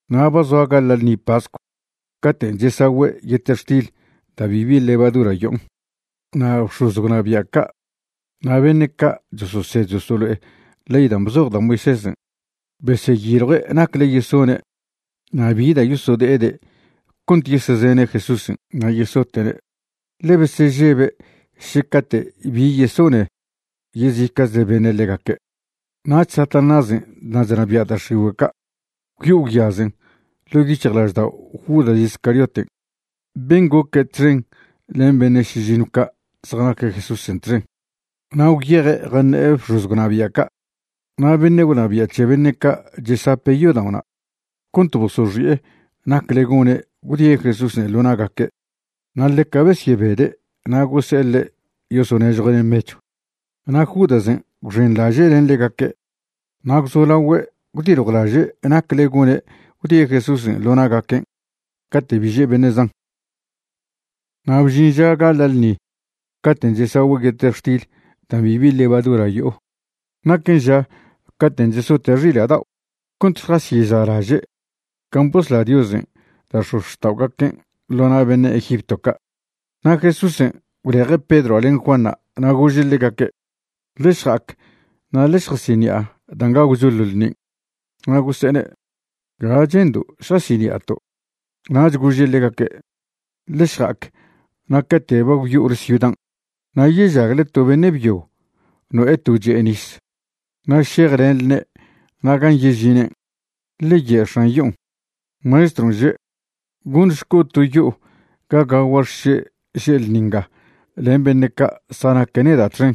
Na' ba zoa gaḻa' ḻṉi pascw caten' chesagüe' yetextil da' bibi levadura yo'on. Na' bx̱oz gwnabia' ca' na' beṉe' ca' chososed chosolo'e ley dan' bzoj da' Moisésen' beseyiljue' nacle yesone' na' bi da' yosode'ede' cont yesezene' Jesúsen' na' yesote'ne', ḻe besežebe' še cate' bi yesone yezica'chle beṉe' ḻegaque'. Nach Satanásen' dan' chnabia' da' x̱igüe' ca' gwyo'o gwyazen ḻo' yic̱hjlaždao' Judas Iscarioten' ben' goque' txen len beṉe' šižiṉw ca' zjanaque' Jesúsen' txen, na' gwyeje' jaṉe'e bx̱oz gwnabia' ca' na' beṉe' gwnabia' c̱he beṉe' ca' chesape' yodao'na' cont bosoxi'e nacle gone' gwdie' Jesúsen' ḻo na'gaque'. Na' ḻeca besyebede' na' gose'e ḻe' yosonežjue'ne' mechw. Na' Judasen' gwxenḻaže' len ḻegaque', na' gwzolagüe' gwdiljwlaže' nacle gone' gwdie' Jesúsen' ḻo na'gaquen' cate' bi že' beṉe' zan. Na' bžin ža gaḻa' ḻṉi caten' chesagüe' yetextil dan' bibi levadura yo'o. Naquen ža cate' chesote' xila' dao' cont šjasyeza'laže' can' bosla Diosen' da' x̱ozxta'ogaquen' ḻo na' beṉe' Egipto ca'. Na' Jesúsen' gwleje' Pedroa' len Juanṉa' na' gože' ḻegaque': ―Ḻe šja'ac na' ḻe šjasiṉi'a dan' gagwcho ḻo ḻṉin'. Na' gose'ene': ―¿Ga che'ndo' šjasiṉi'ato'? Nach gože' ḻegaque': ―Ḻe šja'ac na' cate' ba gwyo'ole ciudan' na' yežagle to beṉe' byo no'e to che'e nis. Na' šejlenḻne' na' gan' yežinen' ḻe ye' x̱an yo'on': “Maestron' že': Gonšco' to yo'o ga gagua' xše' že' ḻṉi nga len beṉe' ca' zjanaque' neda' txen.”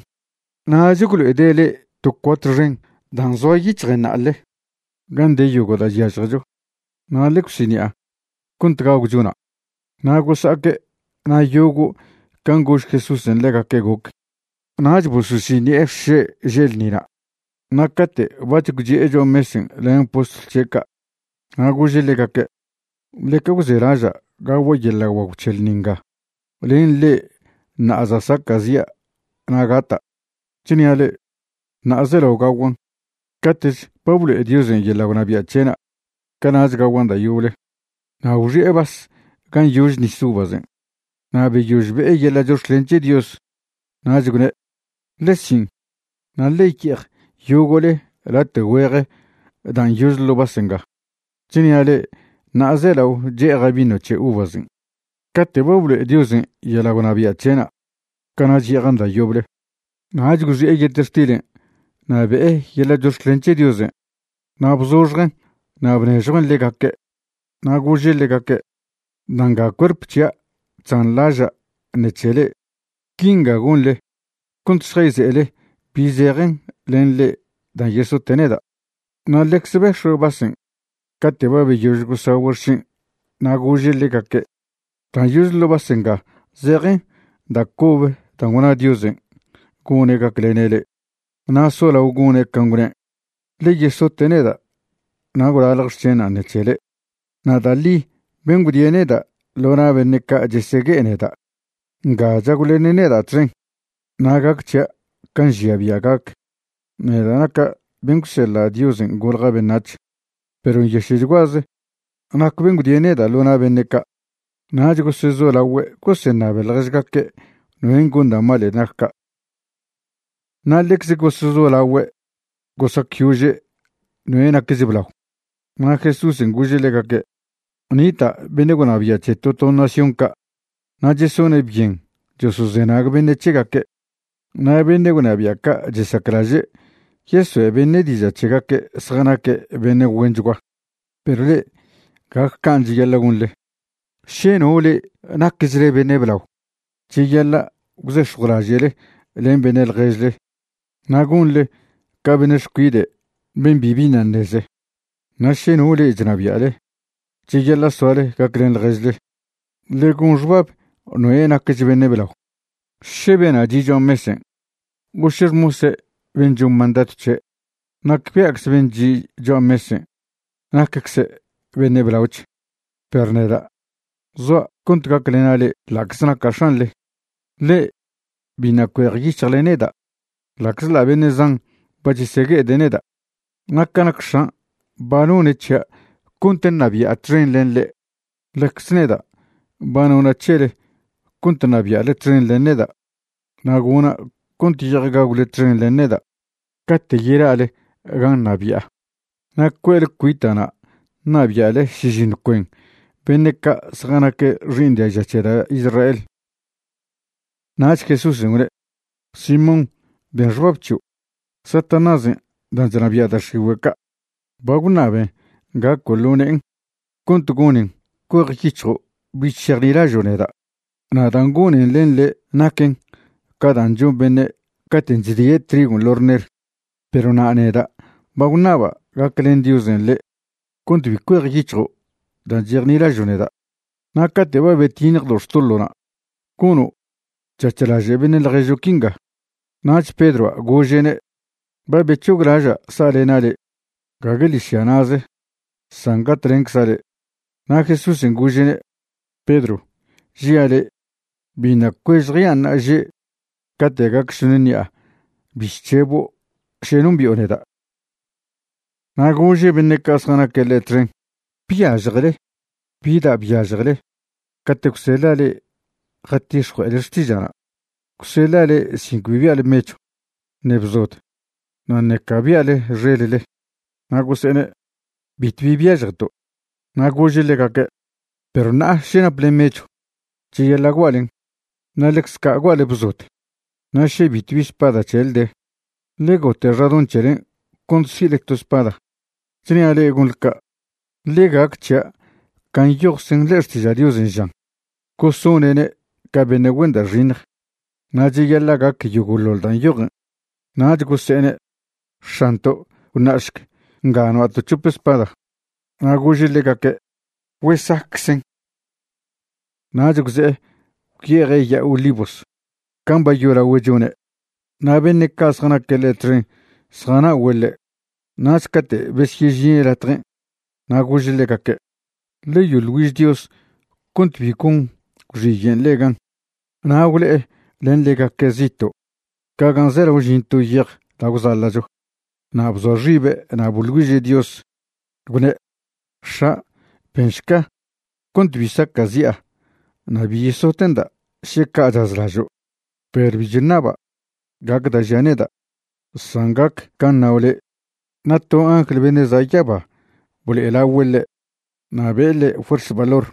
Nach gwlo'ede' le'e to cuart xen dan' zoa yic̱hjen na'ale gan' de yogo' da' chyažjecho. Na' ḻe gwsiṉi'a cont gagwcho na'. Na' gosa'aque' na' yogo' can' gož Jesúsen' ḻegaque' goc. Nach bososiṉi'e xše' že' ḻṉina'. Na' cate' bac̱h gwchi'e cho'a mesen' len postlw c̱he' ca', na' gože' ḻegaque': ―Ḻeca gwzelaža' gagua' yeḻa' guagw c̱he ḻṉi nga len le'e ṉa'a za' saca'zi'a na' gata'. Chnia' le'e, ṉa'a zelao gaguan'. Cate'ch ba blo'e Diosen' yeḻa' gwnabia' c̱he'na', cana'ch gaguan' da' yoble. Na' gwxi'e vas gan' yože nis uvasen', na' beyož be'e yeḻa' chox̱clen c̱he Dios, nach gwne': ―Ḻe sin', na' ḻe ye'ej yogo'le late' güeje dan' yože ḻo' vas nga. Chnia' le'e ṉa'a zelao che'eja' vino c̱he uvasen'. Cate' ba blo'e Diosen' yeḻa' gwnabia' c̱he'na', cana'ch ye'ejan' da' yoble. Nach gwxi'e yetextilen' na' be'e yeḻa' chox̱clen c̱he Diosen' na' bzoxjen' na' bnežjuen' ḻegaque'. Na' gože' ḻegaque': ―Da' nga cuerp c̱hia' chzanḻaža' ṉec̱he le'e. Quinga gonḻe cont šjayze'ele bi zejen len le'e dan' yesote' neda'. Na' ḻecze bex̱ue' vasen' cate' ba beyož gosagüe' xšen' na' gože' ḻegaque': ―Dan' yože ḻo' vas nga zejen da' cobe dan' gwna Diosen' gone' gaclene' le'e. Na' solao gone' can' gwne', ḻe yesote' neda' na' gwlalj xc̱henan' ṉec̱he le'e. ’Na' da' ḻi ben' gwdie' neda' ḻo na' beṉe' ca' chesegue'e neda' nga chagwlene' neda' txen. Na' gac c̱hia' can' nžia bia' gac, neda' naca' bena' gwseḻa' Diosen' golja' beṉac̱h, perw nyaše'chguaze nac ben' gwdie' neda' ḻo na' beṉe' ca'. Nach gosezolagüe' goseṉabe ḻježgaque' noen' gon da' malen' nac ca'. Na' ḻecze gosezolagüe' gosacyože' noe' nacch blao. Na' Jesúsen' gože' ḻegaque': ―Nita' beṉe' gwnabia' c̱he to to nación ca' na' chesone' byen chosozenag beṉe' c̱hegaque', na' beṉe' gwnabia' ca' chesaclaže' yesoe' beṉe' diža' c̱hegaque' zjanaque' beṉe' güenchgua. Perw le'e gague can' cheyaḻa' gonḻe. Še no le'e nacchle beṉe' blao, cheyaḻa' gwzex̱jwlaže'le len beṉe' ḻježle na' gonḻe ca beṉe' xcuide' ben' bibi ṉa' ṉeze. Na' še no le'e chnabia'le, cheyaḻa' soale gaclen ḻježle. Ḻe gon xbab noe' nacch beṉe' blao, še bena' chi' cho'a mesen' o še xmosen' ben' chon mandadw c̱he'. Nacbia'cze ben' chi' cho'a mesen' naccze' beṉe' blaoch. Perw neda', zoa' cont gaclena' le'e ḻa'cze naca' X̱anḻe. ’Le'e biṉa' cuejyic̱hjle neda' ḻa'czḻa' beṉe' zan ba chesegue'ede' neda'. Na' ca nac X̱an' ba none' c̱hia' cont ṉabi'a txen len ḻe', ḻecze neda' ba nona' c̱hele cont ṉabia'le txen len neda'. Na' gona' cont ye'ej gagwle txen len neda' cate' yela'le gan' ṉabi'a, na' cue'le cuita'na' ṉabia'le šižiṉw cuen beṉe' ca' zjanaque' xi'iṉ diaža c̱he da' Israel. Nach Jesúsen' gwne': ―Simón, ben xbab c̱hio', Satanásen' dan' chnabia' da' x̱igüe' ca' ba gwṉaben gaco' ḻo ne'en cont gonen cuejyic̱hjo' bich šejnilažo' neda'. Na' dan' gonen len le' naquen ca dan' chon beṉe' caten' chdie' trigon' ḻo' rner. Perw na' neda' ba gwṉaba' gaclen Diosen' le' cont bi cuejyic̱hjo' dan' chejnilažo' neda'. Na' cate' ba betiṉjdo' xtoḻo'na', gono' c̱hac̱h laže' beṉe' ḻježo' quinga. Nach Pedroa' gože'ne': ―Ba bec̱hoglaža' sa'alena' le', gague ḻižya na'ze, san gatlencza' le'. Na' Jesúsen' gože'ne': ―Pedro, žia' le', biṉa' cuež jean' ṉa'aže' cate' gac šoṉ ṉi'a bi chc̱hebo' še nombi'o neda'. Na' gože' beṉe' ca' zjanaque' ḻe' txen: ―¿Byažjele bi da' byažjele cate' gwseḻa' le'e jatix̱jue'ele xtiža'na'? Gwseḻa' le'e sin cbi bia'le mechw, ṉe bzod, na' ṉeca bia'le xelle. Na' gose'ene': ―Bitw bi byažjeto'. Na' gože' ḻegaque': ―Perw ṉa'a še naple mechw, cheyaḻa' gua'len, na' ḻecze ca' gua'le bzod. Na' še bitw bi spada c̱hele de, ḻe gote' xadoṉ c̱helen' cont si'le to spada. Chnia' le'e gonḻe ca', ḻe gac c̱hia' can' nyojczen ḻe'e Xtiža' Diosen' žan: “Gosone'ne' ca beṉe' güen da' xiṉj.” Na' cheyaḻa' gac yogo'ḻoḻ dan' nyojen. Nach gose'ene': ―X̱anto', gwṉa'šc nga noa'to' c̱hope spada. Na' gože' ḻegaque': ―Güesaqueczen. Nach gwze'e gwyeje' Ya'a Olivos can' ba yolagüe' chone', na' beṉe' ca' zjanaque' ḻe' txen zjana'ogüe' ḻe'. Nach cate' besyežine' latjen' na' gože' ḻegaque': ―Ḻe yoḻ güiž Dios cont bi gon gwxiyen' le'e gan. Na' gwle'e len ḻegaque' zito' ca gan' zelao žin to yej da' gwzaḻa'cho, na' bzoa xibe' na' boḻ güiže' Dios, gwne': ―X̱a', benšca cont bi saca'zi'a na' bi yesote'nda' še ca' chazlažo', perw bi chṉaba' gac da' žia' neda', san gac can' ṉao' le'. Na' to angl beṉe' za' yaba blo'elagüe' ḻe' na' be'e ḻe' fuerz valor.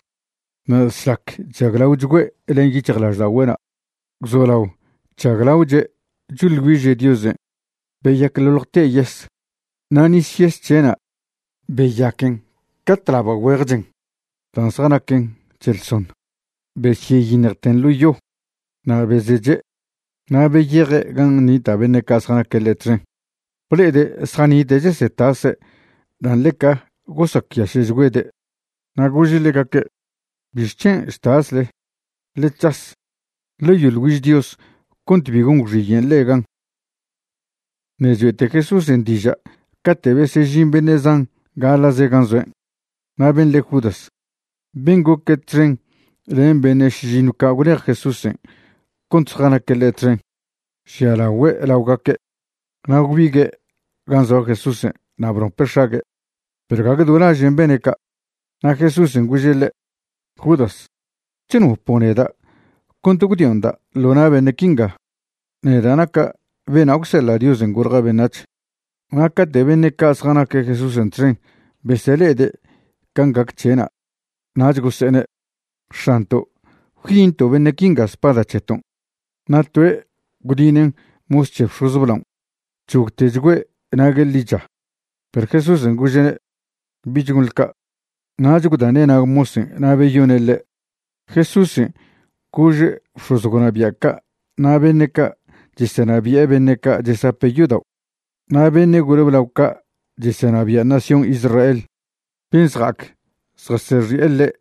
Na' šlac chžaglaochgüe' len yic̱hjlažda'ogüe'na' gwzolao chžaglaoche' choḻ güiže' Diosen' beyacḻoḻjte' yes. Na' nis yes c̱he'na' beyaquen ca tlaba' güeje chen dan' zjanaquen c̱heḻsoṉ, besyeyiṉjten ḻo yo. Na' bezeche', na' beyeje' gan' nita' beṉe' ca' zjanaque' ḻe' txen, ble'ede' zjanite' chesetase' dan' ḻeca gosacyaše'chgüede'. Na' gože' ḻegaque': ―¿Bixc̱hen' chtasle? Ḻe c̱has, ḻe yoḻ güiž Dios cont bi gon gwxiyen' le'e gan. Ṉe' choe'te Jesúsen' diža' cate' besežin beṉe' zan gaḻa'ze gan' zoen'. Na' ben' le' Judas, ben' goque' txen len beṉe' šižiṉw ca' gwlej Jesúsen' cont zjanaque' ḻe' txen, žialagüe' laogaque'. Na' gwbigue' gan' zoa Jesúsen' na' bnope' x̱ague', perw gague do lažen' bene' ca'. Na' Jesúsen' gože' ḻe': ―Judas, ¿chnopo' neda' cont gwdio'nda' ḻo na' beṉe' quinga? neda' naca' bena' gwseḻa' Diosen' golja' beṉac̱h. Na' cate' beṉe' ca' zjanaque' Jesúsen' txen besele'ede' can' gac c̱he'na' nach gose'ene': ―X̱anto', ¿gwyinto' beṉe' quinga spada c̱heton'? Na' toe' gwdinen' mos c̱he bx̱oz blaon', gwc̱hogtechgüe' nague' ḻicha. Perw Jesúsen' gože'ne': ―Bich gonḻe ca'. Nach gwdane' nag mosen' na' beyone' ḻe'. Jesúsen' gože' bx̱oz gwnabia' ca' na' beṉe' ca' chesenabi'e beṉe' ca' chesape' yodao', na' beṉe' gole blao ca' chesenabia' nación Israelen' ben' zja'ac zjasexi'e ḻe',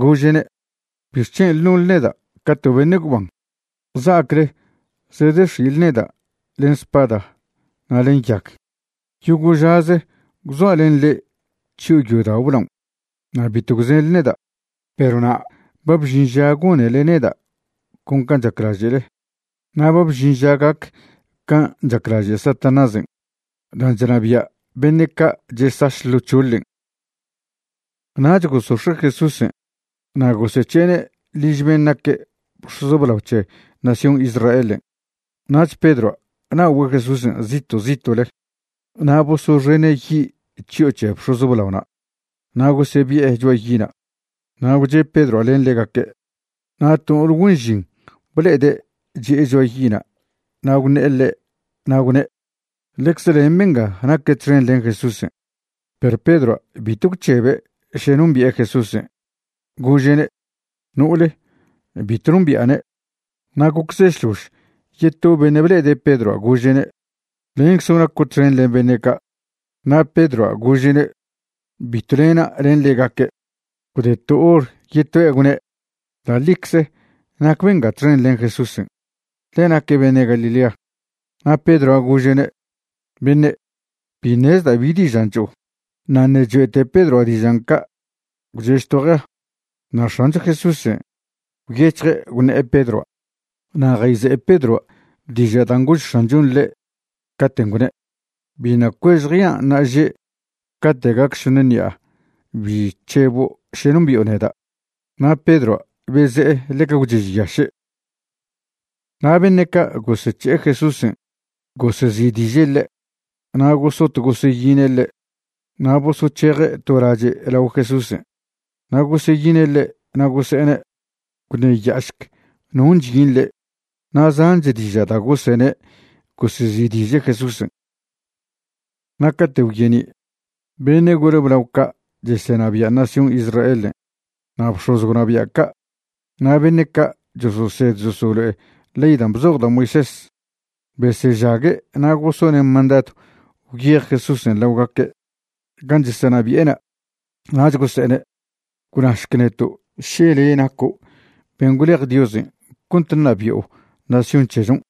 gože'ne': ―¿Bixc̱hen' nonḻe neda' ca to beṉe' gwban za'acle zedex̱i'le neda' len spada na' len yag? Yogo' žaze gwzoa' len le'e chyo'o yodao' blaon' na' bitw gwzenḻe neda'. Perw na' ba bžin ža gonele neda' con can' chaclaže'le, na' ba bžin ža gac can' chaclaže' Satanásen' dan' chnabia' beṉe' ca' chesaš ḻo c̱hoḻen'. Nach gosox̱e' Jesúsen' na' gosec̱he'ene' liž ben' naque' bx̱oz blao c̱he nación Israelen'. Nach Pedroa' na'ogüe' Jesúsen' zito' zito'le. Na' bosoxene' yi' chyo'o c̱he bx̱oz blaona' na' gosebi'e cho'a yi'na'. Na' gwche' Pedroa' len ḻegaque'. Na' to no'ole güen žin ble'ede' chi'e cho'a yi'na' na' gwṉe'e ḻe' na' gwne': ―Ḻecze len benga naque' txen len Jesúsen'. Perw Pedroa' bitw gwc̱hebe' še nombi'e Jesúsen'. Gože'ne': ―No'ole, bitw nombi'ane'. Na' gocze šlož, yeto beṉe' ble'ede' Pedroa' gože'ne': ―Lenczo' naco' txen len beṉe' ca'. Na' Pedroa' gože'ne': ―Bitw lena' len ḻegaque'. Gwde to hor yetoe' gwne': ―Da' ḻicze nac benga txen len Jesúsen', ḻe naque' beṉe' Galilea. Na' Pedroa' gože'ne': ―Beṉe', bi ṉezda' bi dižan' cho'o. Na' ṉe' choe'te Pedroa' dižan' ca', gwchež to jea. Na' X̱ancho Jesúsen' gwyec̱hje' gwṉe'e Pedroa' na' jayze'e Pedroa' diža' dan' gož X̱anchon' ḻe' caten' gwne': “Biṉa' cuež jean' ṉa'aže' cate' gac šoṉe ṉi'a bi c̱hebo' še nombi'o neda'.” Na' Pedroa' beze'e ḻeca gwchežyaše'. Na' beṉe' ca' gosec̱he'e Jesúsen' gosezi'diže' ḻe', na' gosot goseyine' ḻe'. Na' bosoc̱heje' to lache' lao Jesúsen' na' goseyine' ḻe' na' gose'ene': ―Gwṉeya'ašc non' chyin le'. Na' zanch diža' da' gosene' gosezi'diže' Jesúsen'. Na' cate' gwyeni', beṉe' gole blao ca' chesenabia' nación Israelen' na' bx̱oz gwnabia' ca' na' beṉe' ca' chososed chosolo'e ley dan' bzoj da' Moisés besežague' na' gosone' mandadw gwyej Jesúsen' laogaque' gan' chesenabi'ena', nach gose'ene': ―Gwnašc neto' še le' naco' ben' gwlej Diosen' cont ṉabi'o nación c̱hechon'.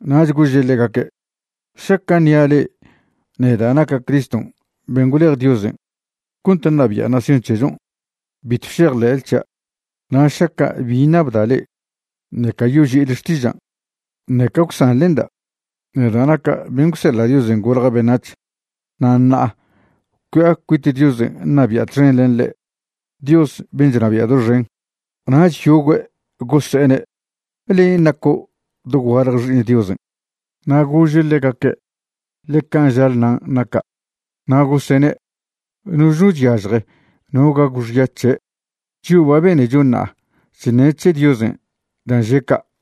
Nach gože' ḻegaque': ―Šaca' ṉia' le'e neda' naca' Criston' ben' gwlej Diosen' cont ṉabia' nación c̱hechon', bitw šejḻe'le c̱hia'. Na' šaca' bi ṉabda' le'e, ṉeca yoži'ile xtižan', ṉeca gwsanḻenda. Neda' naca' ben' gwseḻa' Diosen' golja' beṉac̱h. Na' ṉa'a cui'a cuit Diosen' ṉabi'a txen len ḻe', Dios ben' chnabia' doxen. Nach yogüe' yose'ene': ―¿Len' naco' dogualje Xi'iṉ Diosen'? Na' gože' ḻegaque': ―Ḻe can' žale nan' naca'. Na' gosene': ―¡Noch no chyažje no gagw xya c̱he'! Chio' ba benecho ṉa'a chṉe' c̱he Diosen' dan' že' ca'.